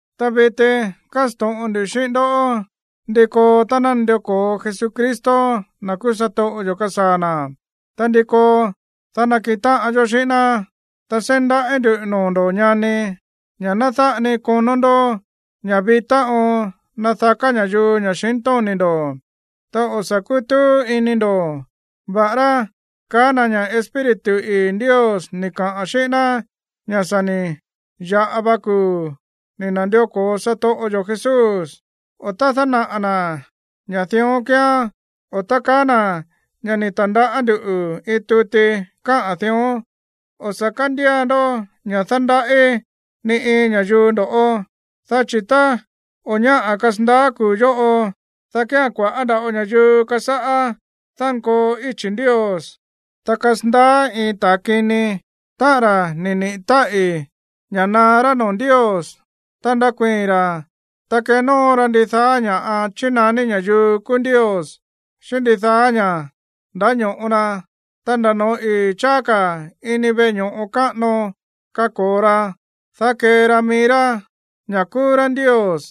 Ta viti kásto̱ꞌon ndu xíꞌín ndó ndi koo tá ná nandió ko̱o Jesucristo, na̱ kúú satoꞌo yo̱, kasaa̱ na̱, ta ndi koo, dá nakiꞌin táꞌan yó xíꞌín ná. Ta seí ndaꞌí ndu̱ noo̱ ndo̱ꞌó, ñani, ña̱ ná dáꞌa ni konó ndó ña̱ vitá oon nadaká ña̱yuu ña̱xintóni̱ ndo̱, ta o̱ sa̱ kútúú ini ndo̱, va̱ꞌará kaá na̱ ña̱ Espíritu ii̱ Ndios ni̱ kaꞌa̱n xíꞌín ná ña̱ sa̱ ni̱ ya̱ꞌa va kuu̱ ni̱ na̱ndió ko̱o satoꞌo yo̱ Jesús, o tá dánaꞌa̱ na̱ ña̱ dión kíán o tá kaá na̱ ña̱ ni̱ ta̱ndaꞌá nduꞌu̱ iin tuti káꞌa̱n dión. O̱ sa̱ kándía ndó ña̱ dándaꞌí ni iin ña̱yuu ndo̱ꞌó, dá chi̱ tá o̱ ñáꞌa̱ kasandaá kuu̱ yóꞌo, dá kía̱n kua̱ꞌá nda̱ꞌo ña̱yuu kasáꞌá dánkoo íchi̱ Ndios, ta kasandaá iin ta̱a kini, táꞌa̱n ra̱ ni̱ niꞌi̱ táꞌi̱ ña̱ na̱á rá noo̱ Ndios. Ta ndakuii̱n ra̱, ta kenóo ra ndidaá ña̱ꞌa chínaní ña̱yuu kúú ndios, xíꞌín ndidaá ña̱ꞌa ndáño̱ꞌo na. Ta nda̱ noo̱ ii̱ cháá ka̱ ini veꞌe ño̱ꞌo káꞌano kako̱o ra, dá kee ra mií rá ña̱ kúú rá ndios.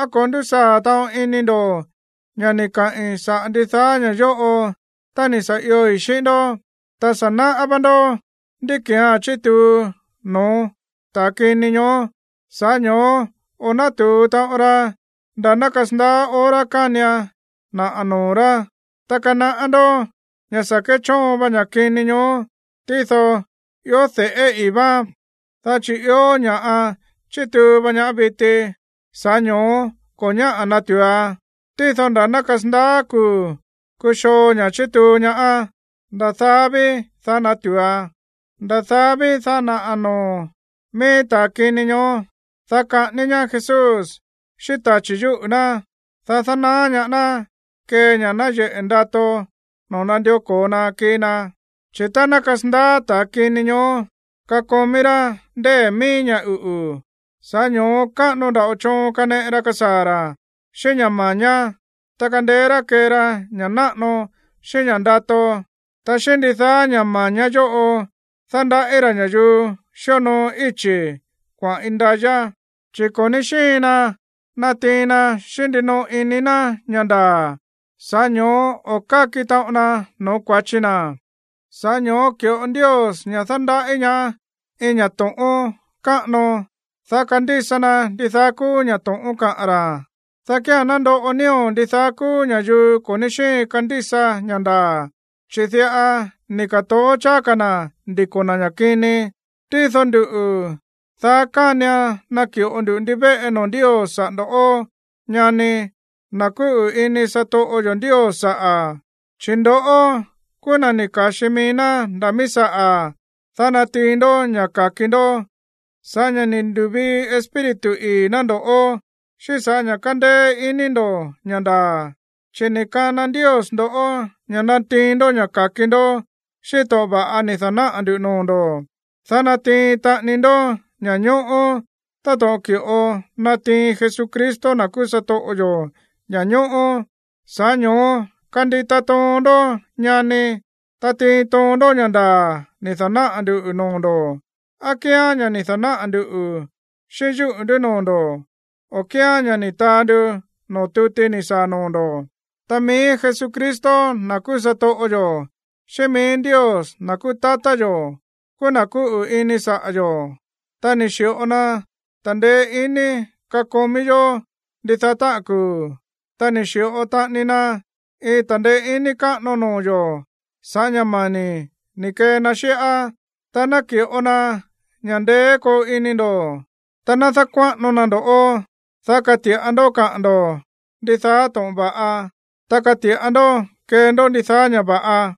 ¿Á ko̱ ndúsaa̱ taꞌon ini ndo̱ ña̱ ni̱ kaꞌi̱n saꞌa̱ ndidaá ña̱ yóꞌo tá ni̱ sa̱ ioi̱ xíꞌín ndó? Ta sa̱ náꞌá vá ndoꞌó ndí ki̱án chítuu no̱ó ta̱ kini ñoó, sa̱ꞌá ño̱ó o̱ nátu̱u taꞌon ra nda̱ ná kasandaá hora kánian naꞌa̱ noo̱ rá. Ta kanaꞌá ndó ña̱ sa̱ kéchóon va ña̱ kini ñoó, tído ió de̱ꞌé ii̱ váán, dá chi̱ ió ña̱ chítuu va ña viti, sa̱ꞌá ño̱ó ko̱ ñáꞌa̱ natu̱uan. Tído nda̱ ná kasandaá kuu̱ kuxoo ña̱ chítuu ñaá, nda̱ daá ví, dá natu̱uan. Nda̱ daá ví, dá naꞌa̱ noo̱ mií ta̱a kini ñoó. Dá kaꞌání ñaá Jesús xíꞌín tachi̱ yúꞌu̱ ná, dá dánaá ñaá ná kee ña̱ nayeꞌe̱ ndato no̱ó nandió ko̱o na kii na. Chi̱ tá ná kasandaá ta̱ kini ñoó, kakomí rá ndée̱ mií ña̱ uꞌu̱, sa̱ꞌá ño̱ó káꞌano nda̱ꞌo choon kaneꞌe ra kasaa̱ ra̱ xíꞌín ña̱ ma̱ñá, ta kandeé rá kee ra ña̱ꞌa náꞌano xíꞌín ña̱ꞌa ndato. Ta xíꞌín ndidaá ña̱ ma̱ñá yóꞌo dándaꞌí ra̱ ña̱yuu xíonoo íchi̱ kuaꞌa̱n indayá, chi̱ ko̱ ní xíin na natiin na xíꞌín ndinoo ini na̱ ña̱ ndaa̱, sa̱ꞌá ño̱ó o̱ káki taꞌon na no̱ó kua̱chi na̱. Sa̱ꞌá ño̱ó ki̱ꞌo Ndios ña̱ dándaꞌí ñaá iin ña̱ to̱ꞌón káꞌano, dá kandísa na ndidaá kúú ña̱ to̱ꞌón kaꞌa̱n ra̱, dá kía̱n nandoꞌo nío̱ ndidaá kúú ña̱yuu ko̱ ní xíin kandísa ña̱ ndaa̱, chi̱ diꞌa ni̱ ka̱toó cháá ka̱ na̱ ndiko̱ na̱ ña̱ kini. Tído nduꞌu̱, daá kánian naki̱ꞌo ndu ndivéꞌe noo̱ Ndios saꞌa̱ ndo̱ꞌó, ñani, na̱ kúꞌu̱ ini satoꞌo yo̱ Ndios saꞌa̱. Chi̱ ndoꞌó kúú na̱ ni̱ ka̱xi mií ná nda̱ mií saꞌa̱, dá natiin ndó ña̱ ka̱ki ndó sa̱ꞌá ña̱ ni̱ ndu̱vii Espíritu ii̱ ná ndo̱ꞌó, xíꞌín sa̱ꞌá ña̱ kándéé iní ndo̱ ña̱ ndaa̱. Chi̱ ni̱ kana Ndios ndo̱ꞌó ña̱ natiin ndó ña̱ ka̱ki ndó xíꞌín to̱ꞌon va̱ꞌa ni̱ da̱náꞌa̱ ndu̱ noo̱ ndo̱, dá natiin taꞌani ndó ña̱ñóꞌó táto̱ꞌon ki̱ꞌo natiin Jesucristo, na̱ kúú satoꞌo yo̱, ña̱ñóꞌó. Sa̱ꞌá ño̱ó kandita toon ndó, ñani, ta tiin toon ndó ña̱ ndaa̱ ni̱ da̱náꞌa̱ nduꞌu̱ noo̱ ndo̱, á kíán ña̱ ni̱ da̱náꞌa̱ ndu̱ xíꞌín yúꞌu̱ ndú noo̱ ndo̱, o á kíán ña̱ ni̱ taa ndu noo̱ tuti ni̱ saa̱ noo̱ ndo̱. Ta mií Jesucristo, na̱ kúú satoꞌo yo̱, xíꞌín mií Ndios, na̱ kúú tatá yo̱, kúú na̱ kúꞌu̱ ini saꞌa̱ yo̱, ta ni̱ xi̱ꞌo na ta̱ndeé iní kakomí yó ndidaá táꞌa̱n kuu̱, ta ni̱ xi̱ꞌo taꞌani na iin ta̱ndeé iní káꞌano noo̱ yo̱ sa̱ꞌá ña̱ mani̱ ni̱ kee na xíꞌá, ta naki̱ꞌo na ña̱ ndeé koo ini ndo̱, ta ná dákuáꞌano na ndo̱ꞌó, dá kati̱ꞌa ndó kaꞌa̱n ndo̱ ndidaá to̱ꞌon va̱ꞌa, ta kati̱ꞌa ndó kee ndó ndidaá ña̱ va̱ꞌa.